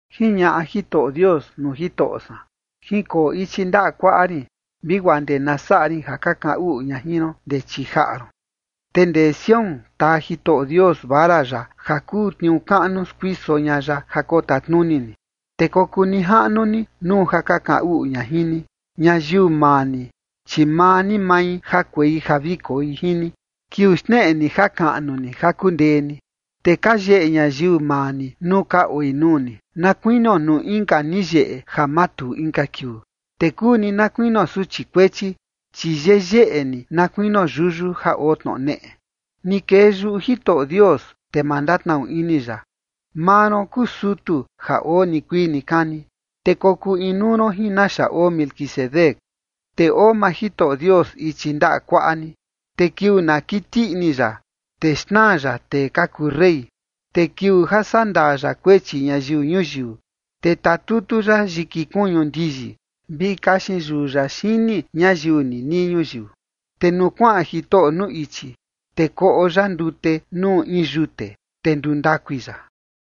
Jiñaꞌa Jitoꞌo Dios nuu Jitoꞌo san: “Jinkoo ichi ndaꞌa kuaꞌa rin, vi guaa ndee na saꞌa rin ja ka kaꞌan uꞌu ña jin ron ndee chii jaꞌa ron”. Te ndee Sión taa Jitoꞌo Dios vara ya ja kuu tniuu kaꞌnu skuiso ña ya ja kotatnuni ni, te kokuu nijaꞌnu ni nuu ja ka kaꞌan uꞌu ña jin ni. Ñayiu maa ni, chi maa ni mai jakuei ja vi koi jin ni, kiuu xneꞌe ni jakaꞌnu ni ja kundee ni. Te ka yeꞌe ñayiu maa ni nuu ka oi nuu ni, na kuinio nuu inka ni yeꞌe ja matuu inka kiuu. Te kuu ni na kuinio suchi kuechi, chi yeyeꞌe ni, na kuinio yuyu ja oo tnoꞌo neꞌe. Ni kee yuꞌu Jitoꞌo Dios, te ma ndatnaꞌnu ini ya: Maa ron kuu sutu ja oo nikuii nikani, te kokuu inuu ron jin naxa oo Melquisedec. Te oo maa Jitoꞌo Dios ichi ndaꞌa kuaꞌa ni, te kiuu na kiti ini ya, te xnaa ya tee ka kuu rey. Te kiuu ja sandaa ya kuechi ñayiu ñuyiu, te tatutu ya yiki kuñu ndiyi, vi kaxin yuu ya xini ñayiu ninii ñuyiu. Te nuu kuaꞌan Jitoꞌo nuu ichi, te koꞌo ya ndute nuu in yute, te ndundakui ya.